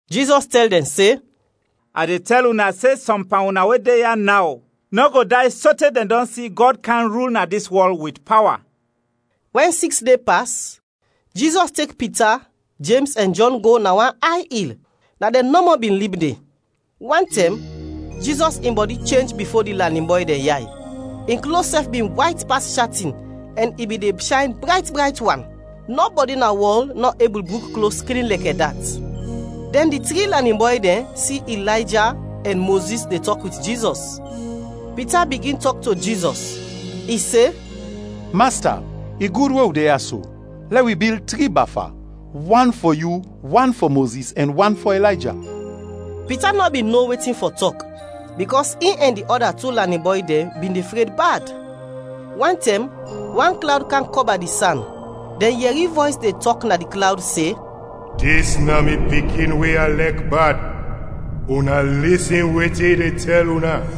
Jizɔs tɛl dɛn se, “A de tɛl una se sɔm pan una we de ya naw, nɔ go day sote dɛn dɔn si Gɔd kam rul na dis wɔl wit pawa.” Wɛn siks de pas, Jizɔs tek Pita, Jems ɛn Jɔn go na wan ay il, na dɛn nɔmɔ bin lib de. Wantɛm, Jizɔs in bɔdi chenj bifo di lanin bɔy dɛn yay; in klos sɛf bin wayt pas shatin ɛn i bin de shayn brayt brayt wan, nɔbɔdi na wɔl nɔ ebul bruk klos klin lɛkɛ dat. Dɛn di tri lanin bɔy dɛn si Ilayja ɛn Mozis de tɔk wit Jizɔs. Pita bigin tɔk to Jizɔs. I se, “Masta, i gud we wi de ya so! Lɛ wi bil tri bafa, wan fɔ yu, wan fɔ Mozis, ɛn wan fɔ Ilayja.” Pita nɔ bin no wetin fɔ tɔk, bikɔs in ɛn di ɔda tu lanin bɔy dɛn bin de fred bad. Wantɛm wan klawd kam kɔba di san, dɛn yɛri vɔys de tɔk na di klawd se, “Dis na mi Pikin we a lɛk bad, una lisin wetin i de tɛl una.”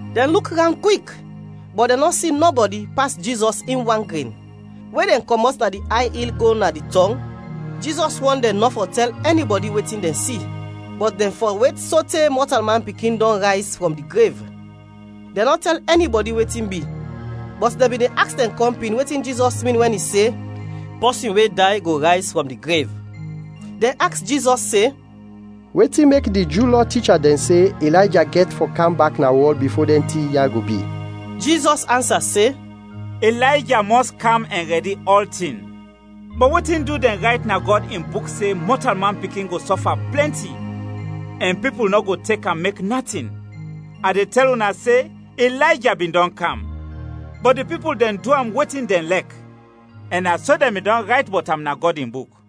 Dɛn luk rawnd kwik, bɔt dɛn nɔ si nɔbɔdi pas Jizɔs in wan gren. We dɛn kɔmɔt na di ay il go na di tɔng, Jizɔs wɔn dɛn nɔ fɔ tɛl ɛnibɔdi wetin dɛn si, bɔt dɛn fɔ wet sote Mɔtalman Pikin dɔn rayz frɔm di grev. Dɛn nɔ tɛl ɛnibɔdi wetin bi, bɔt dɛn bin de aks dɛn kɔmpin wetin Jizɔs min wɛn i se, “Pɔsin we day go rayz frɔm di grev.” Dɛn aks Jizɔs se, “Wetin mek di Ju Lɔ ticha dɛn se Ilayja gɛt fɔ kam bak na wɔl bifo dɛn tin ya go bi?” Jizɔs ansa se, “Ilayja mɔs kam ɛn rɛdi ɔltin. Bɔt wetin du dɛn rayt na Gɔd in Buk se Mɔtalman Pikin go sɔfa plɛnti ɛn pipul nɔ go tek am mek natin? A de tɛl una se, Ilayja bin dɔn kam, bɔt di pipul dɛn du am wetin dɛn lɛk, ɛn na so dɛn bin dɔn rayt bɔt am na Gɔd in Buk.”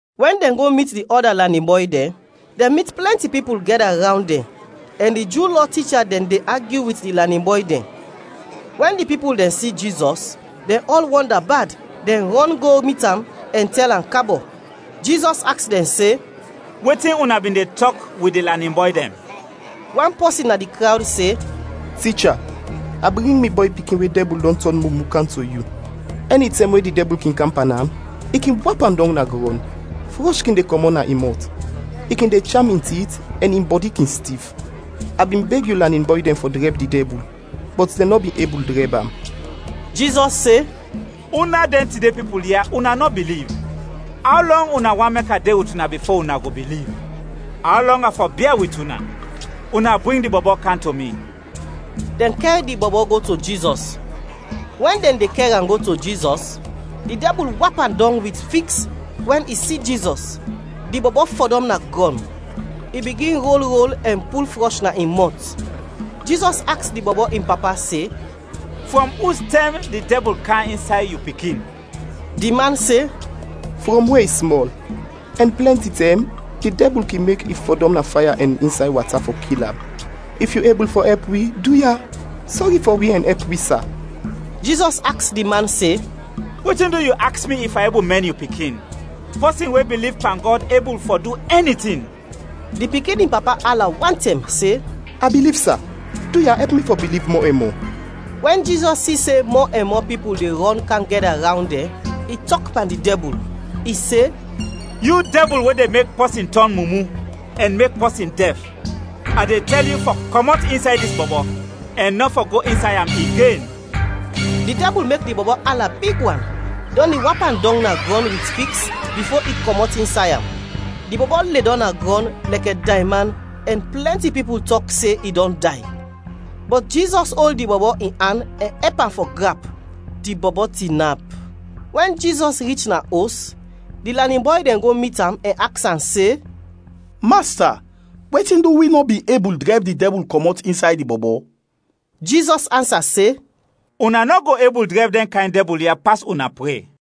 Wɛn dɛn go mit di ɔda lanin bɔy dɛn, dɛn mit plɛnti pipul gɛda rawnd dɛn, ɛn di Ju Lɔ ticha dɛn de agyu wit di lanin bɔy dɛn. Wɛn di pipul dɛn si Jizɔs, dɛn ɔl wɔnda bad, dɛn rɔn go mit am ɛn tɛl am kabɔ. Jizɔs aks dɛn se, “Wetin una bin de tɔk wit di lanin bɔy dɛn?” Wan pɔsin na di krawd se, “Ticha, a bring mi bɔy pikin we dɛbul dɔn tɔn mumu kam to yu. Ɛnitɛm we di dɛbul kin kam pan am, i kin wap am dɔng na grɔn, frɔsh kin de kɔmɔt na in mɔt, i kin de cham in tit ɛn in bɔdi kin stif. A bin beg yu lanin bɔy dɛn fɔ drɛb di dɛbul, bɔt dɛn nɔ bin ebul drɛb am.” Jizɔs se, “Una dɛn tide pipul ya, una nɔ biliv, aw lɔng una want mek a de wit una bifo una go biliv? Aw lɔng a fɔ bia wit una? Una bring di bɔbɔ kam to mi!” Dɛn kɛr di bɔbɔ go to Jizɔs. Wɛn dɛn de kɛr am go to Jizɔs, di dɛbul wap am dɔng wit fiks wɛn i si Jizɔs. Di bɔbɔ fɔdɔm na grɔn, i bigin rol rol ɛn pul frɔsh na in mɔt. Jizɔs aks di bɔbɔ in papa se, “Frɔm ustɛm di dɛbul kam insay yu pikin?” Di man se, “Frɔm we i smɔl. Ɛn plɛnti tɛm di dɛbul kin mek i fɔdɔm na faya ɛn insay wata fɔ kil am. If yu ebul fɔ ɛp wi, duya, sɔri fɔ wi ɛn ɛp wi, sa.” Jizɔs aks di man se, “Wetin du yu aks mi if a ebul mɛn yu pikin? Pɔsin we biliv pan Gɔd ebul fɔ du ɛni tin.” Di pikin in papa ala wantɛm se, “A biliv, sa, duya, ɛp mi fɔ biliv mɔ ɛn mɔ!” Wɛn Jizɔs si se mɔ ɛn mɔ pipul de rɔn kam gɛda rawnd dɛn, i tɔk pan di dɛbul; i se, “Yu dɛbul we de mek pɔsin tɔn mumu, ɛn mek pɔsin dɛf, a de tɛl yu fɔ kɔmɔt insay dis bɔbɔ, ɛn nɔ fɔ go insay am igen!” Di dɛbul mek di bɔbɔ ala big wan, dɔn i wap am dɔng na grɔn wit fiks bifo i kɔmɔt insay am. Di bɔbɔ ledɔm na grɔn lɛkɛ dayman ɛn plɛnti pipul tɔk se i dɔn day. Bɔt Jizɔs ol di bɔbɔ in an ɛn ɛp am fɔ grap, di bɔbɔ tinap. Wɛn Jizɔs rich na os, di lanin bɔy dɛn go mit am ɛn aks am se, “Masta, wetin du wi nɔ bin ebul drɛb di dɛbul kɔmɔt insay di bɔbɔ?” Jizɔs ansa se, “Una nɔ go ebul drɛb dɛn kayn dɛbul ya pas una pre.”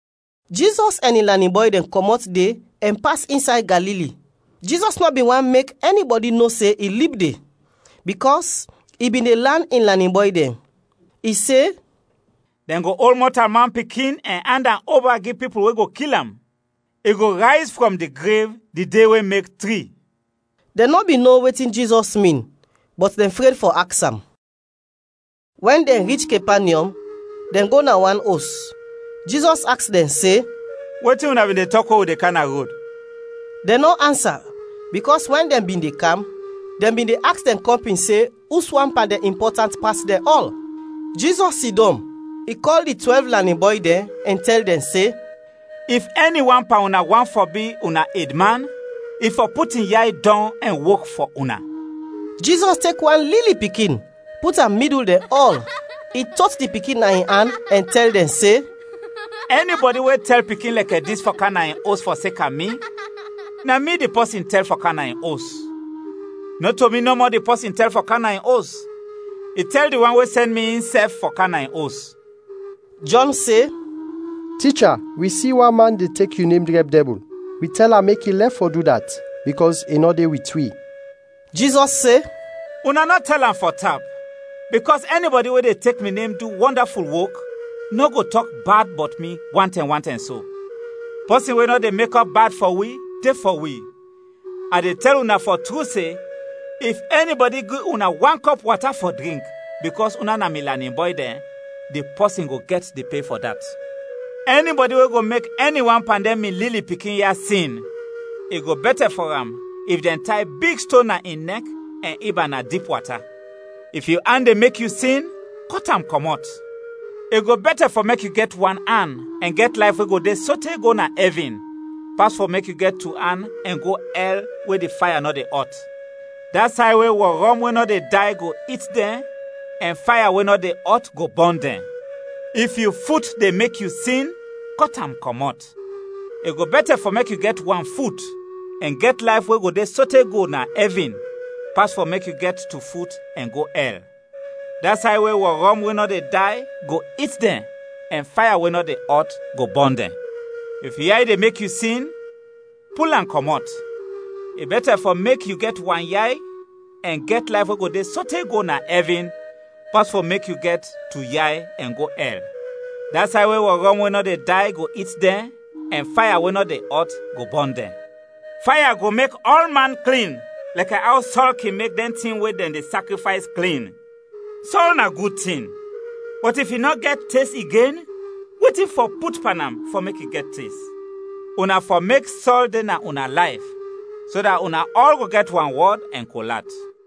Jizɔs ɛn in lanin bɔy dɛn kɔmɔt de ɛn pas insay Galili. Jizɔs nɔ bin want mek ɛnibɔdi no se in lib de, bikɔs i bin de lan in lanin bɔy dɛn. I se, “Dɛn go ol Mɔtalman Pikin ɛn and am oba gi pipul we go kil am. I go rayz frɔm di grev di de we mek tri.” Dɛn nɔ bin no wetin Jizɔs min, bɔt dɛn fred fɔ aks am. Wɛn dɛn rich Kepanyɔm, dɛn go na wan os. Jizɔs aks dɛn se, “Wetin una bin de tɔk we wi de kam na rod?” Dɛn nɔ ansa, bikɔs wɛn dɛn bin de kam, dɛn bin de aks dɛn kɔmpin se uswan pan dɛn impɔtant pas dɛn ɔl. Jizɔs sidɔm, i kɔl di twɛlv lanin bɔy dɛn ɛn tɛl dɛn se, “If ɛni wan pan una want fɔ bi una edman, i fɔ put in yay dɔng ɛn wok fɔ una.” Jizɔs tek wan lili pikin, put am midul dɛn ɔl. I tot di pikin na in an ɛn tɛl dɛn se, “Ɛnibɔdi we tɛl pikin lɛkɛ dis fɔ kam na in os fɔseka mi, na mi di pɔsin tɛl fɔ kam na in os; nɔto mi nɔmɔ di pɔsin tɛl fɔ kam na in os, i tɛl di wan we sɛn mi, insɛf fɔ kam na in os.” Jɔn se, “Ticha, wi si wan man de tek yu nem drɛb dɛbul. Wi tɛl am mek i lɛf fɔ du dat, bikɔs i nɔ de wit wi.” Jizɔs se, “Una nɔ tɛl am fɔ tap, bikɔs ɛnibɔdi we de tek mi nem du wɔndaful wok, nɔ go tɔk bad bɔt mi wantɛm, wantɛm so. Pɔsin we nɔ de mekɔp bad fɔ wi, de fɔ wi. A de tɛl una fɔ tru se, if ɛnibɔdi gi una wan kɔp wata fɔ drink bikɔs una na mi lanin bɔy dɛn, di pɔsin go gɛt di pe fɔ dat. “Ɛnibɔdi we go mek ɛni wan pan dɛn mi lili pikin ya sin, i go bɛtɛ fɔ am if dɛn tay big ston na in nɛk ɛn ib am na dip wata. If yu an de mek yu sin, kɔt am kɔmɔt; i go bɛtɛ fɔ mek yu gɛt wan an ɛn gɛt layf we go de sote go na ɛvin, pas fɔ mek yu gɛt tu an ɛn go ɛl we di faya nɔ de ɔt. [ Da say we wɔrɔm we nɔ de day go it dɛn ɛn faya we nɔ de ɔt go bɔn dɛn.] If yu fut de mek yu sin, kɔt am kɔmɔt, i go bɛtɛ fɔ mek yu gɛt wan fut ɛn gɛt layf we go de sote go na ɛvin, pas fɔ mek yu gɛt tu fut ɛn go ɛl. [ Da say we wɔrɔm we nɔ de day go it dɛn ɛn faya we nɔ de ɔt go bɔn dɛn.] If yu yay de mek yu sin, pul am kɔmɔt, i bɛtɛ fɔ mek yu gɛt wan yay ɛn gɛt layf we go de sote go na ɛvin, pas fɔ mek yu gɛt tu yay ɛn go ɛl. Da say we wɔrɔm we nɔ de day go it dɛn ɛn faya we nɔ de ɔt go bɔn dɛn. “Faya go mek ɔlman klin lɛkɛ aw sɔl kin mek dɛn tin we dɛn de sakrifays, klin. “Sɔl na gud tin, bɔt if i nɔ gɛt tes igen, wetin fɔ put pan am fɔ mek i gɛt tes? “Una fɔ mek sɔl de na una layf, so dat una ɔl go gɛt wanwɔd ɛn kol at.”